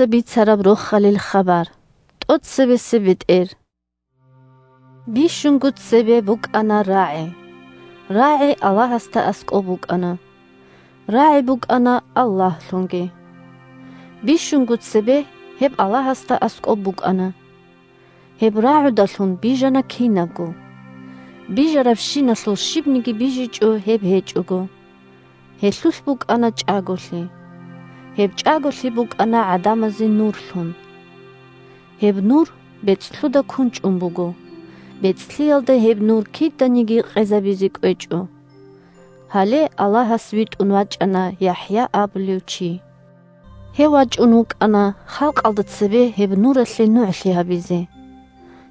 бетӀер Байбихьи 1Бищунго цебе букӀана РагӀи. РагӀи Аллагьасда аскӀоб букӀана. РагӀи букӀана Аллагьлъунги. Бищунго цебе гьеб Аллагьасда аскӀоб букӀана. Гьеб РагӀудалъун бижана кинабго. Бижарабщиналъул щибниги бижичӀо гьеб гьечӀого. Гьелъулъ букӀана чӀаголъи. Гьеб чӀаголъи букӀана гӀадамазе Нурлъун. Гьеб Нур бецӀлъуда кунчӀун буго, бецӀлъиялда гьеб Нур киданиги къезабизе кӀвечӀо. Гьале Аллагьас витӀун вачӀана ЯхӀя абулев чи. Гьев вачӀун вукӀана халкъалда цебе гьеб Нуралъе нугӀлъи гьабизе,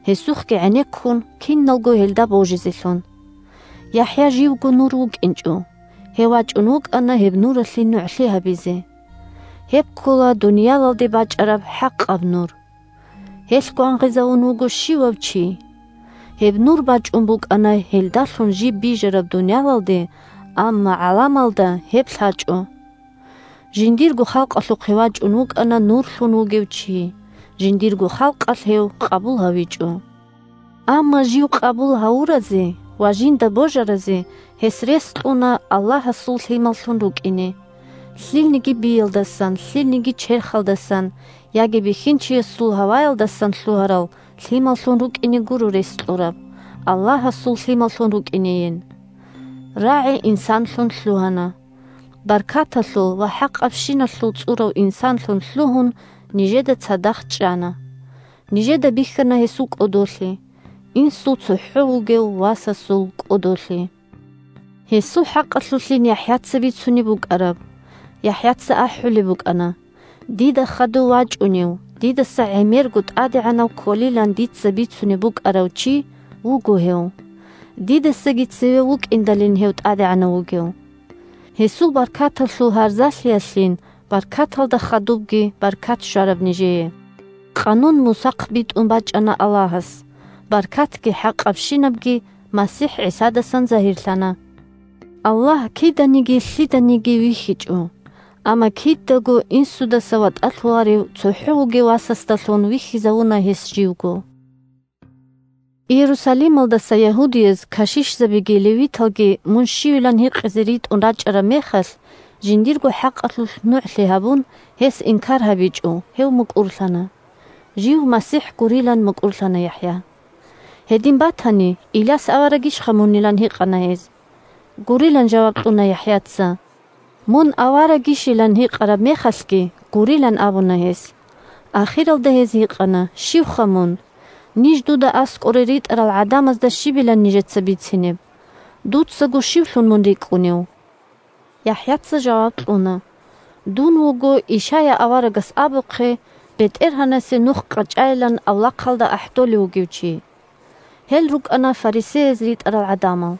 гьесухъги гӀенеккун, киналго гьелда божизелъун. ЯхӀя живго Нур вукӀинчӀо, гьев вачӀун вукӀана гьеб Нуралъе нугӀлъи гьабизе. Гьеб ккола дуниялалде бачӀараб хӀакъаб Нур. Гьелъ гвангъизавун вуго щивав чи. Гьеб Нур бачӀун букӀана гьелдалъун жиб бижараб дуниялалде, амма гӀаламалда гьеб лъачӀо. Жиндирго халкъалъухъе вачӀун вукӀана Нурлъун вугев чи, жиндирго халкъалъ гьев къабул гьавичӀо. Амма жив къабул гьавуразе ва жинда божаразе гьес рес кьуна Аллагьасул лъималлъун рукӀине. Лъилниги биялдасан, лъилниги черхалдасан яги бихьинчиясул гьаваялдасан лъугьарал лъималлъун рукӀине гуро рес кьураб, Аллагьасул лъималлъун рукӀинейин. РагӀи инсанлъун лъугьана, баркаталъул ва хӀакъабщиналъул цӀурав инсанлъун лъугьун, нижеда цадахъ чӀана. Нижеда бихьана гьесул кӀодолъи – Инсул цохӀо вугев Васасул кӀодолъи. Гьесул хӀакъалъулъин ЯхӀяца бицунеб букӀараб. ЯхӀяца ахӀулеб букӀана: «Дида хадув вачӀунев дидаса гӀемерго тӀадегӀанав кколилан дица бицунеб букӀарав чи вуго гьев. Дидасаги цеве вукӀиндалин гьев тӀадегӀанав вугев!» Гьесул баркаталъул гьарзалъиялъин баркаталда хадубги баркат щвараб нижее. Къанун Мусахъ битӀун бачӀана Аллагьас, баркатги хӀакъабщинабги МасихӀ ГӀисадасан загьирлъана. Аллагь киданиги лъиданиги вихьичӀо, амма кидаго Инсудаса ватӀалъуларев цохӀо вугев Васасдалъун вихьизавуна гьес живго. Иерусалималдаса ягьудияз кашишзабиги левиталги мун щивилан гьикъизе ритӀун рачӀараб мехалъ, жиндирго хӀакъалъулъ нугӀлъи гьабун, гьес инкар гьабичӀо, гьев мукӀурлъана – жив МасихӀ гурилан мукӀурлъана ЯхӀя. Гьедин батани, Иляс аварагищха мунилан гьикъана гьез. Гурилан жаваб кьуна ЯхӀяца. Мун аварагищилан гьикъараб мехалъги гурилан абуна гьес. Ахиралда гьез гьикъана: – Щивха мун? Ниж дуда аскӀоре ритӀарал гӀадамазда щибилан нижеца бицинеб? Дуцаго щивлъун мун рикӀкӀунев? ЯхӀяца жаваб кьуна: – Дун вуго, Ишая аварагас абухъе: «БетӀергьанасе нух къачӀайилан авлахъалда ахӀдолев вугев чи!» Гьел рукӀана фарисеяз ритӀарал гӀадамал.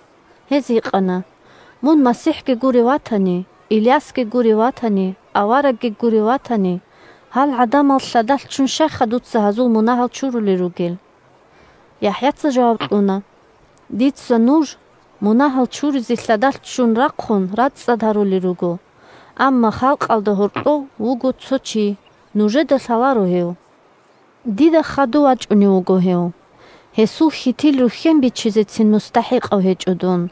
Гьез гьикъана: – Мун МасихӀги гурев ватани, Илясги гурев ватани, аварагги гурев ватани, гьал гӀадамал лъадалъ ччун щайха дуца гьазул мунагьал чурулел ругел? ЯхӀяца жаваб кьуна: – Дица нуж, мунагьал чуризе лъадалъ ччун рахъун, рацӀцӀад гьарулел руго, амма халкъалда гьоркьов вуго цо Чи. Нужеда лъаларо гьев. Дида хадув вачӀунев вуго гьев. Гьесул хьитил рухьен бичизецин мустахӀикъав гьечӀо дун.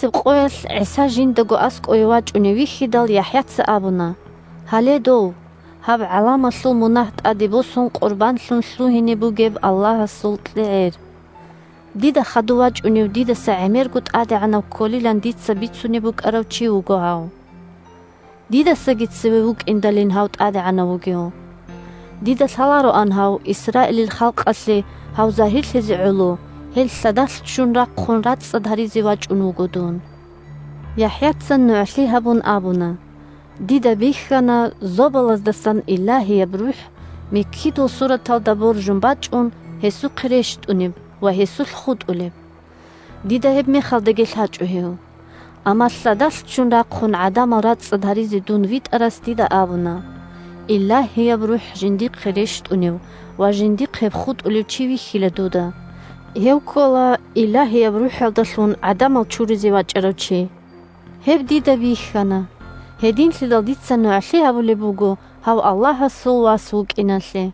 Нахъисеб къоялъ ГӀиса жиндаго аскӀове вачӀунев вихьидал, ЯхӀяца абуна: – Гьале дов – гьаб гӀаламалъул мунагь тӀаде босун къурбанлъун лъугьине бугеб Аллагьасул КьегӀер. Дида хадув вачӀунев дидаса гӀемерго тӀадегӀанав кколилан дица бицунеб букӀарав чи вуго гьав. Дидасаги цеве вукӀиндалин гьав тӀадегӀанав вугев! Дида лъалароан гьав, Исраилил халкъалъе гьав загьирлъизе гӀоло, гьел лъадалъ ччун рахъун рацӀцӀад гьаризе вачӀун вуго дун. ЯхӀяца нугӀлъи гьабун абуна: – Дида бихьана зобалаздасан Илагьияб РухӀ, миккидул сураталда боржун бачӀун, гьесухъе рещтӀунеб ва гьесулъ хутӀулеб. Дида гьебмехалдаги лъачӀо гьев. Амма лъадалъ ччун рахъун гӀадамал рацӀцӀад гьаризе дун витӀарас дида абуна: «Илагьияб РухӀ жиндихъе рещтӀунев ва жиндихъ гьеб хутӀулев чи вихьила дуда. Гьев ккола Илагьияб РухӀалдалъун гӀадамал чуризе вачӀарав чи». Гьеб дида бихьана, гьединлъидал дица нугӀлъи гьабулеб буго гьав Аллагьасул Вас вукӀиналъе.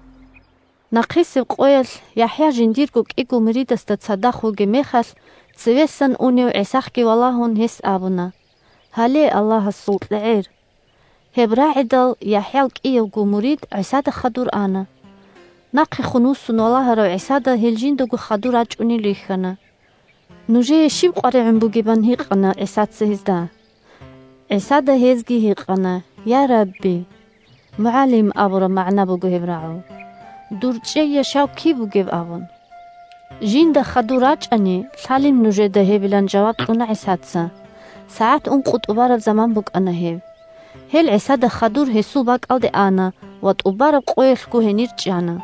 Нахъисеб къоялъ ЯхӀя жиндирго кӀиго муридасда цадахъ вугеб мехалъ, цевесан унев ГӀисахъги валагьун, гьес абуна: – Гьале Аллагьасул КьегӀер. Гьеб рагӀидал ЯхӀял кӀиявго мурид ГӀисада хадур ана. Нахъехун вуссун валагьарав ГӀисада гьел жиндаго хадур рачӀунел рихьана. – Нужее щиб къваригӀун бугеб? – ан гьикъана ГӀисаца гьезда. ГӀисада гьезги гьикъана: – Я, Рабби! («МугӀалим» абураб магӀна буго гьеб рагӀул.) Дур чӀей, яшав киб бугеб? – абун. Жинда хадур рачӀани лъалин нужеда гьебилан жаваб кьуна ГӀисаца. (СагӀат ункъо тӀубараб заман букӀана гьеб.) Гьел ГӀисада хадур гьесул бакӀалде ана ва тӀубараб къоялъго гьенир чӀана.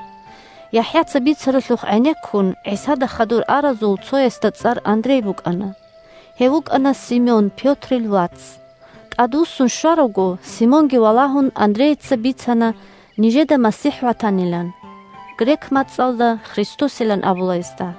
ЯхӀяца бицаралъухъ гӀенеккун, ГӀисада хадур аразул цоясда цӀар Андрей букӀана. Гьев вукӀана Симон Пётрил вац. ТӀадвуссун щваравго, Симонги валагьун, Андрейица бицана нижеда МасихӀ ватанилан. (Грек мацӀалда Христосилан абула гьесда.)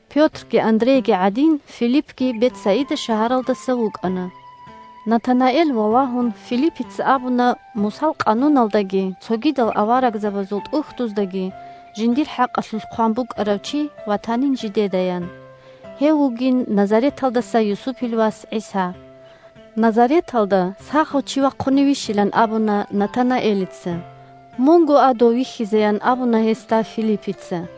Пётрги Андрейги гӀадин, Филиппги Бетсаида шагьаралдаса вукӀана. Натанаэл валагьун, Филиппица абуна Мусал къануналдаги цогидал аварагзабазул ТӀухьдуздаги жиндир хӀакъалъулъ хъван букӀарав чи ватанин жидедаян. Гьев вугин Назареталдаса Юсупил вас ГӀиса. Назареталда сахав чи вахъуневищилан абуна Натанаэлица. Мунго а дов вихьизеян абуна гьесда Филиппица.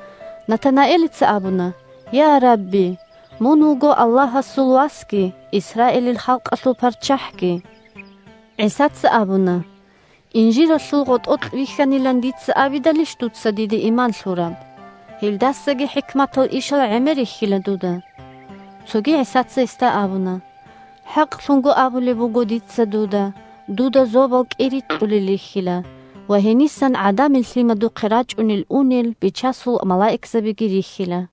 Натанаэлица абуна: – Я, Рабби! Мун вуго Аллагьасул Васги, Исраилил халкъалъул ПарччахӀги! ГӀисаца абуна: – Инжиралъул гъотӀокь вихьанилан дица абидалищ дуца диде иман лъураб? Гьелдасаги хӀикматал ишал гӀемер рихьила дуда. Цоги ГӀисаца гьесда абуна: – ХӀакълъун абулеб буго дица дуда: дуда зобал кӀирикьулел рихьила ва гьенисан ГӀадамил Лъимадухъе рачӀунел-унел Бичасул малаикзабиги рихьила.